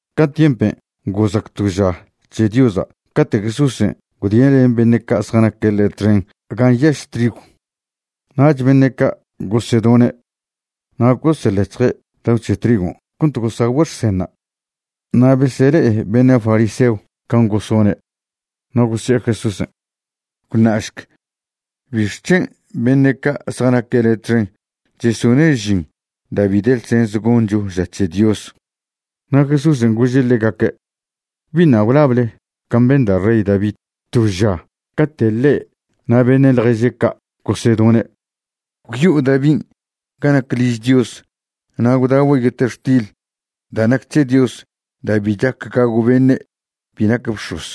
Ca tiempen' gozac to ža c̱he Diosa' cate' Jesúsen' gwdie' len beṉe' ca' zjanaque' ḻe' txen gan' nyaž trigw. Nach beṉe' ca' gosedone', na' goseḻec̱hje' dao c̱he trigon' cont gosagüe' xsenṉa'. Na' besele'e beṉe' fariseon' can' gosone', na' gosi'e Jesúsen': ―Gwṉašc ¿bixc̱hen' beṉe' ca' zjanaque' le' txen chesone' žin da' bi de ḻsens goncho ža c̱he Dios? Na' Jesúsen' gože' ḻegaque': ―¿Biṉa' gwlable can' ben da' rey Davin' to ža cate' ḻe' na' beṉe' ḻježe' ca' gosedone'? Gwyo'o Davin' ga nac liž Dios na' gwdagüe' yetextil da' nac c̱he Dios da' bi chac gagw beṉe' bi nac bx̱oz,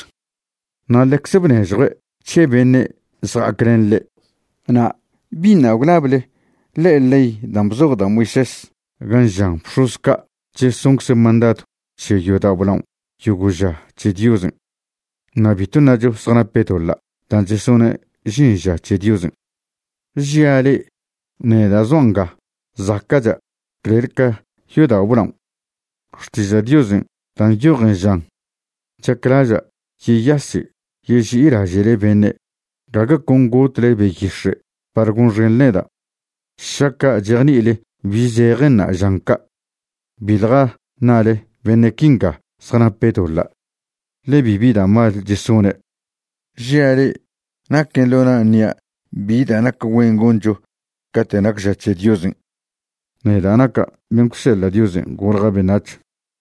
na' ḻecze bnežjue' c̱he beṉe' zja'ac len ḻe'. Na' ¿biṉa' gwlable ḻe'e ley dan' bzoj da' Moisés gan' žan bx̱oz ca' chesoncze' mandadw c̱he yodao' blaon' yogo' ža c̱he Diosen'? Na' bitw ṉacho zjanape' doḻa' dan' chesone' žin ža c̱he Diosen'. Žia' le'e, neda' zoa' nga zaca'cha' clel ca yodao' blaon'. Xtiža' Diosen' dan' nyojen žan: “Chaclaža' yeyaše' yeži'ilaže'le beṉe', gague con gotle beyix̱e' par gonxenḻe neda'.” Šaca' chejni'ile bi zejenṉa' žan ca', biḻja ṉale beṉe' quinga zjanape' doḻa', ḻe bibi da' mal chesone'. Žia' le'e, naquen' ḻo na' ṉia' bi da' nac güen goncho cate' nac ža c̱he Diosen', neda' naca' ben' gwseḻa' Diosen' golja' beṉac̱h.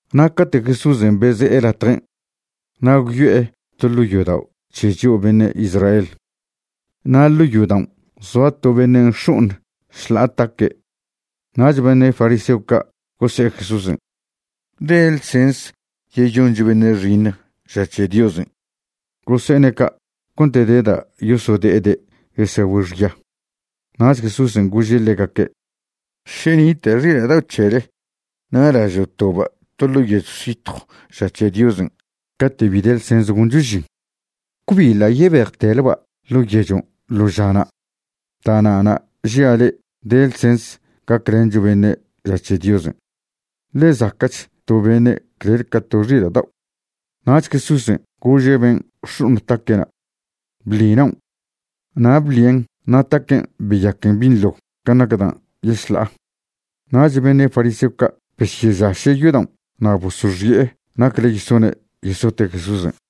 Na' cate' Jesúsen' beze'e latjen', na' gwyo'e to ḻo' yodao' c̱he c̱hio' beṉe' Israel. Na' ḻo' yodaon' zoa to beṉe' nx̱o'oṉ šḻa'a taque', nach beṉe' fariseo ca' gose'e Jesúsen': ―¿De ḻsens yeyoncho beṉe' xiṉj ža c̱he Diosen'? Gose'ene' ca' cont de da' yosode'ede' yesagüe' xya. Nach Jesúsen' gože' ḻegaque': ―Še nita' xila' dao' c̱hele na' lažo' toba' to ḻo' yechw zitjw ža c̱he Diosen' cate' bi de ḻsens goncho žin, ¿cbi ḻa' yebejteleba' ḻo' yechon' ḻo žana'? Da'na'na' žia' le'e de ḻsens gaclencho beṉe' ža c̱he Diosen'. Ḻe zaca'ch to beṉe' clel ca to xila' dao'. Nach Jesúsen' gože' ben' nx̱o'oṉ taque'na': ―Bḻi naon'. Na' bḻien' na' taquen' beyaquen binḻo can' nac dan' yešḻa'a. Nach beṉe' fariseo ca' besyežaše' yodaon' na' bosoxi'e nacle yesone' yesote' Jesúsen'.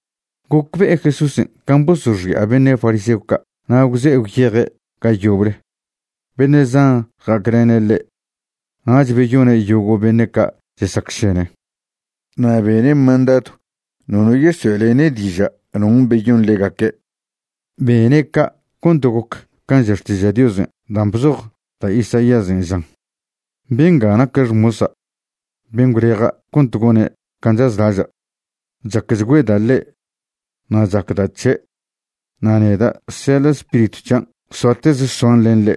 Gocbe'e Jesúsen' can' bosoxi'a beṉe' fariseo ca' na' gwze'e gwyeje' ga yoble. Beṉe' zan ja'aclene' ḻe', nach beyone' yogo' beṉe' ca' chesacšene. Na' bene' mandadw nono yesoe'lene' diža' non' beyon ḻegaque'. Bene' ca' cont goc can' ža Xtiža' Diosen' dan' bzoj da' Isaíasen', žan: Bengan' naque' xmosa', ben' gwleja' cont gone' can' chazlaža'. Chacchgüeda' ḻe', na' chbeda' c̱he'. Na' neda' seḻa' Spiritw c̱hian' soateze soan len ḻe'.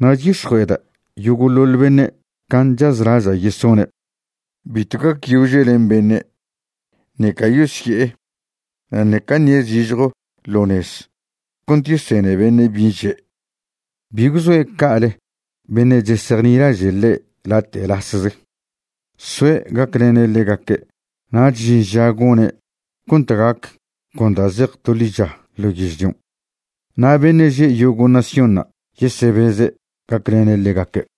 Na' c̱hix̱jue'ede' yogo'ḻoḻ beṉe' can' chazlaža' yesone'. Bitw gacyože' len beṉe', ṉeca yosye'e, na' ṉeca ṉie' zižjo ḻo nez cont yesene beṉe' bin' že'. Bi gwzoe' ca'ale beṉe' chesejnilaže' ḻe' late' lasze. Soe' gaclene' ḻegaque'. Nach žin ža gone' cont gac con da' zej to ḻicha ḻo yežlion'. Na' beṉe' že' yogo' naciónṉa' yesebeze' gaclene' ḻegaque'.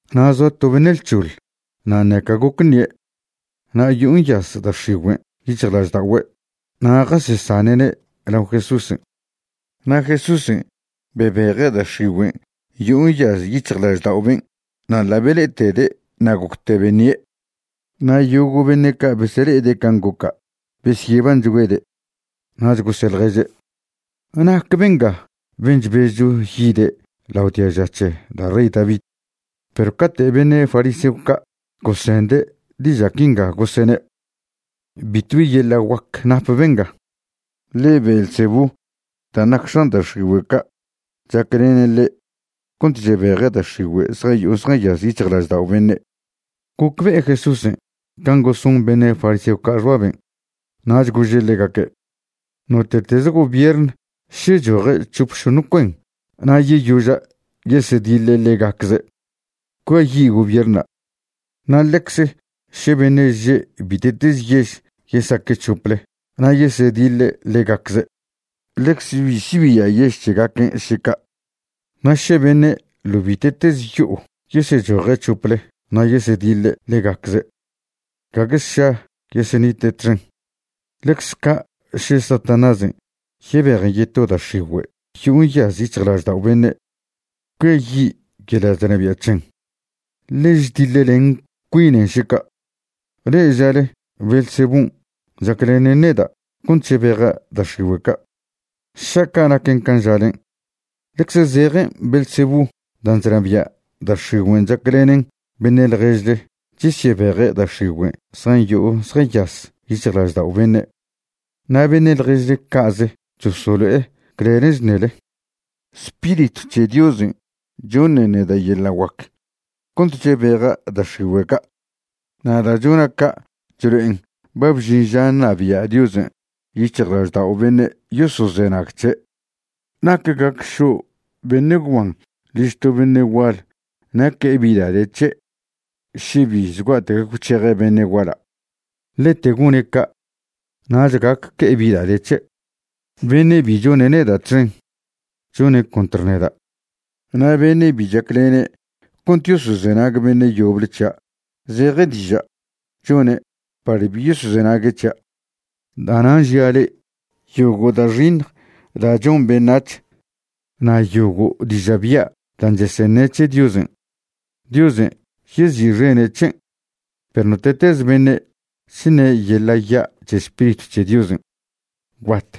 Na' zoa to beṉe' lc̱hoḻ na' ṉeca goc ṉie', na' yo'o nyaz da' x̱igüe' yic̱hjlažda'ogüe' na' jasesane'ne' lao Jesúsen'. Na' Jesúsen' bebeje' da' x̱igüen' yo'o nyaz yic̱hjlaždao' ben' na' ḻa' bele'etede' na' gocte beṉie'. Na' yogo' beṉe' ca' besele'ede' can' goca' besyebanchgüede'. Nach gose'e ḻježe': ―¿Nac benga ben' chbezcho yide' lao diaža c̱he da' rey David? Perw cate' beṉe' fariseo ca' gosende' diža' quinga gosene': ―Bitwbi yeḻa' guac nap benga. Ḻe Beelzebú dan' nac x̱an da' x̱igüe' ca' chaclenen ḻe' cont chebeje' da' x̱igüe' zjayo'o zjanyaz yic̱hjlaždao' beṉe'. Gocbe'e Jesúsen' can' goson beṉe' fariseo ca' xbaben', nach gože' ḻegaque': ―Note'teze gobiern še choje' c̱hop šoṉ cuen na' yeyoža' yesediḻe' ḻegacze', cuiayi' gobierna'. Na' ḻecze še beṉe' že' bite'teze yež yesaque' c̱hople na' yesediḻe' ḻegacze', ḻecze bi sibia' yež c̱hegaquen' še ca'. Na' še beṉe' ḻo' bite'teze yo'o yesechoje' c̱hople na' yesediḻe' ḻegacze', gague sša yesenite' txen. Ḻecze ca' še Satanásen' yebejen yeto da' x̱igüe' yo'o nyaz yic̱hjlaždao' beṉe', cuiayi' yeḻa' chnabia' c̱hen, ḻe chdiḻlen cuinen še ca'. Le'e žale Beelzebún' chaclenen neda' cont chebeja' da' x̱igüe' ca'. Šaca' naquen can' žalen', ḻecze zejen Beelzebú dan' chnabia' da' x̱igüen' chaclenen beṉe' ḻježle chesyebeje' da' x̱igüe' zjayo'o zjanyaz yic̱hjlaždao' beṉe'. Na' beṉe' ḻježle ca'ze chosolo'e clelen' chṉele. Spiritw c̱he Diosen' choṉen neda' yeḻa' guac cont chebeja' da' x̱igüe' ca', na' da' chona' ca' chlo'en ba bžin ža ṉabia' Diosen' yic̱hjlaždao' beṉe' yosozenag c̱he'. ’¿Nac gac šo' beṉe' gwban liž to beṉe' gual na' que'e bi da' de c̱he' še bi zgua'tec gwc̱heje' beṉe' guala'? Ḻete gone' ca' nach gac que'e bi da' de c̱he'. ’Beṉe' bi chone' neda' txen, chone' contr neda'. Na' beṉe' bi chaclene' cont yosozenag beṉe' yoble c̱hia', zeje diža' chone' par bi yosozenague' c̱hia'. ’Da'nan' žia' le'e, yogo' da' xiṉj da' chon beṉac̱h, na' yogo' diža' bya' dan' cheseṉe' c̱he Diosen', Diosen' yezi'xene' c̱hen, perw note'teze beṉe' chṉe' yeḻa' ya' c̱he Spiritw c̱he Diosen', gwbat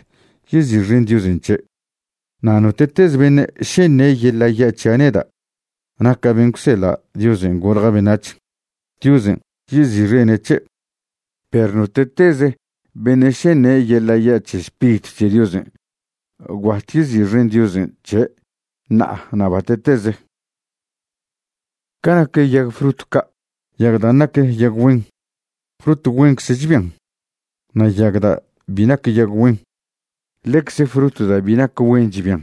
yezi'xen Diosen' c̱he'. Na' note'teze beṉe' še ṉe' yeḻa' ya' c̱hia' neda' naca' ben' gwseḻa' Diosen' golja' beṉac̱h, Diosen' yezi'xene' c̱he', perw note'teze beṉe' še ṉe' yeḻa' ya' c̱he Spiritw c̱he Diosen', gwbat yezi'xen Diosen' c̱he' ṉa'a na' bate'teze. ’Ca nac yag frut ca', yag dan' nac yag güen, frut güencze chbian, na' yag da' bi nac yag güen, ḻecze frut da' bi nac güen chbian.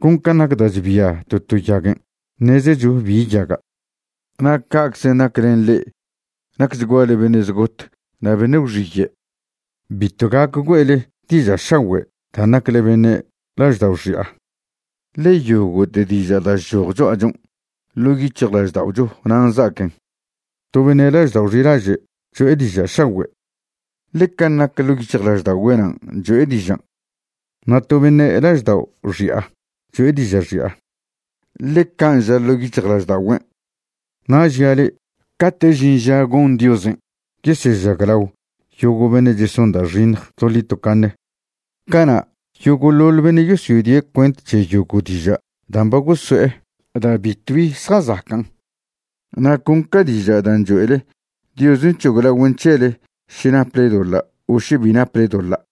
Con can' nac da' chbia to to yaguen' ṉezecho bi yaga'. Na' ca'czen' nac len le'e nacchguale beṉe' zgot na' beṉe' gwxiye'. Bitw gac güe'le diža' šagüe' dan' nacle beṉe' laždao' xi'a. Ḻe yogo'te diža' da' chchoj cho'achon', ḻo' yic̱hjlažda'ocho nan' za'aquen. To beṉe' laždao' xilaže' cho'e diža' šagüe', ḻe can' nac ḻo' yic̱hjlažda'ogüe' nan' cho'e dižan'. Na' to beṉe' laždao' xi'a cho'e diža' xi'a, ḻe can' ža ḻo' yic̱hjlažda'ogüen'. Na' žia' le'e, cate' žin ža gon Diosen' yesežaglao yogo' beṉe' cheson da' xiṉj toḻi tocaṉe, cana' yogo'ḻoḻ beṉe' yosodie' cuent c̱he yogo' diža' dan' ba goso'e da' bitwbi zjazacan'. Na' con ca diža' dan' choe'le, Diosen' c̱hoglagüen' c̱hele še naple doḻa' o še bi naple doḻa'.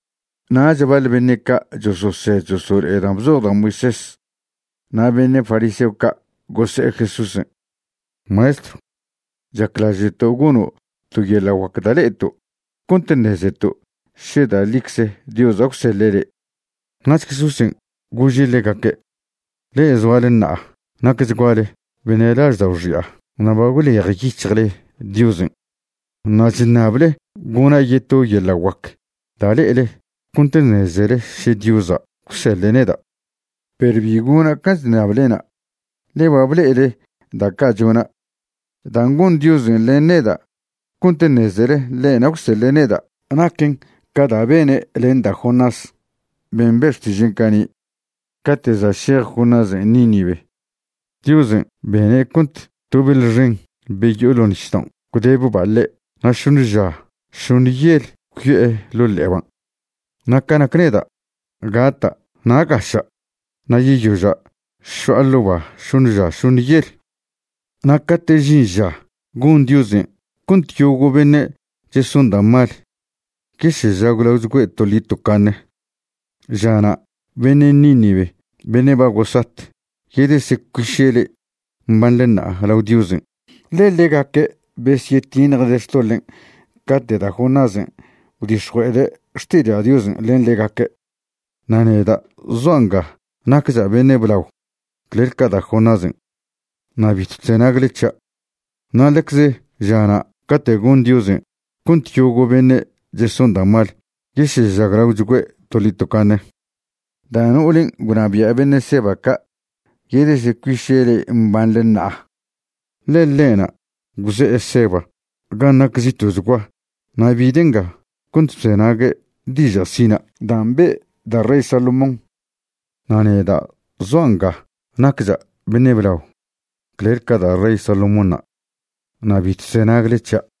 Nach baḻ beṉe' ca' chososed chosolo'e dan' bzoj da' Moisés, na' beṉe' fariseo ca' gose'e Jesúsen': ―Maestrw, chaclaže'to' gono' to yeḻa' guac da' le'eto' cont ṉezeto' še da' ḻicze Diosa' gwseḻe' le'. Nach Jesúsen' gože' ḻegaque': ―Le'e zoale ṉa'a nacchguale beṉe' laždao' xi'a na' ba gwlejyic̱hjle Diosen'. Na' chṉable gona' yeto yeḻa' guac da' le'ele cont ṉezele še Diosa' gwseḻe' neda', perw bi gona' can' chṉablena', ḻe ba ble'ele da' ca' chona'. Dan' gon Diosen' len neda' cont ṉezele ḻe'na' gwseḻe' neda' naquen ca da' bene' len da' Jonás ben' be' xtižen' cani'. Cate' za' šej Jonásen' Nínive, Diosen' bene' cont to beḻ xen be yo'o ḻo' nisdaon' gwdebba' ḻe' na' šoṉe ža šoṉe yel gwyo'e ḻo' ḻe'eban'. Na' ca nac neda', gata' na' gaša', na' yeyoža' šo'a ḻo' ba šoṉe ža šoṉe yel. Na' cate' žin ža gon Diosen' cont yogo' beṉe' cheson da' mal yesežaglagüe' toḻi tocaṉe, žana' beṉe' Nínive beṉe' ba gosat yedesecuiše' le'e mbanḻe ṉa'a lao Diosen', ḻe ḻegaque' besyetiṉjde' xtoḻen' cate' da' Jonásen' gwdix̱jue'ede' xtiža' Diosen' len ḻegaque'. Na' neda' zoa' nga naccha' beṉe' blao clel ca da' Jonásen', na' bitw chzenagle c̱hia'. Na' ḻecze žana' cate' gon Diosen' cont yogo' beṉe' cheson da' mal yesežaglaogüe' toḻi tocaṉe, da' no'olen' gwnabia' beṉe' Seba ca' yedecuiše' le'e mbanḻe ṉa'a. Ḻe ḻe'na' gwze'e Seba gan' nac zito'chgua na' bide' nga cont bzenague' diža' sina' dan' be' da' rey Salomón. Na' neda' zoa' nga naccha' beṉe' blao clel ca da' rey Solomónṉa', na' bitw chzenagle c̱hia'.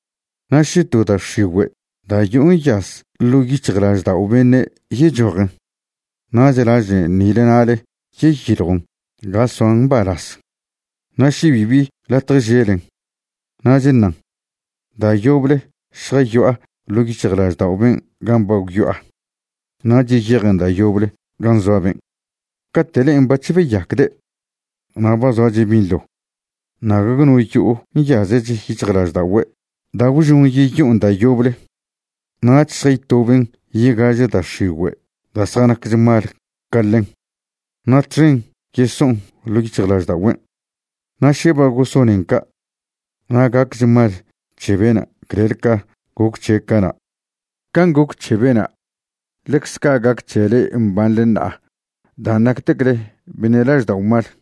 ’Na' še to da' x̱igüe' da' yo'o nyaz ḻo' yic̱hjlaždao' beṉe' yechojen, nach lažen nile nale yeyiljon ga soan mbalaz. Na' še bibi latje želen, nach ṉan: “Da' yoble šjayo'a ḻo' yic̱hjlaždao' ben' gan' ba gwyo'a.” Nach yeyejen da' yoble gan' zoa ben'. Cate' le'en bac̱h beyacde', na' ba zoache' binḻo, na' gague no yo'o nyazech yic̱hjlažda'ogüe' da' gwžon yeyo'on da' yoble, nach šjaytoben yegaže da' x̱igüe' da' zjanaquech mal ca ḻen, na' txen yeso'on ḻo' yic̱hjlažda'ogüen'. Na' še ba gosonen ca', na' gaquech mal c̱he bena' clel ca goc c̱he' cana'. Can' goc c̱he bena', ḻecze ca' gac c̱he le'e mbanḻe ṉa'a dan' nactecle beṉe' laždao' mal.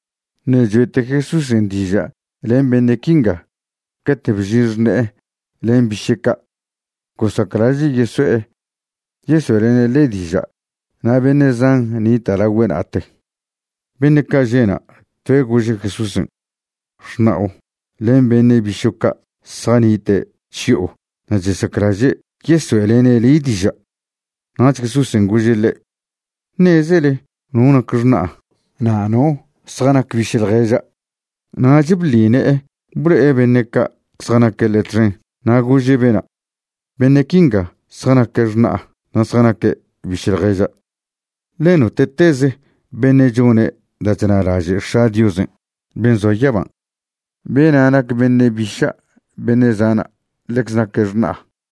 Ṉe' choe'te Jesúsen' diža' len beṉe' quinga, cate' bžin xṉe'e len biše' ca'. Gosaclaže' yeso'e yesoe'lene' ḻe' diža' na' beṉe' zan nita' lagüe' na'ate. Beṉe' ca' že' na', toe' gože' Jesúsen': ―Xṉa'o len beṉe' bišo' ca' zjanite' chyo'o na' chesaclaže' yesoe'lene' le' diža'. Nach Jesúsen' gože' ḻe': ―¿Ṉezele no nac xṉa'a na' no zjanac biše' ḻježa'? Nach bḻi ne'e blo'e beṉe' ca' zjanaque' ḻe' txen na' gože' bena': ―Beṉe' quinga zjanaque' xṉa'a na' zjanaque' biše' ḻježa'. Ḻe note'teze beṉe' chone' da' chnalaže' X̱a' Diosen' ben' zoa yaban', bena' nac beṉe' biša', beṉe' zana', ḻecze naque' xṉa'a.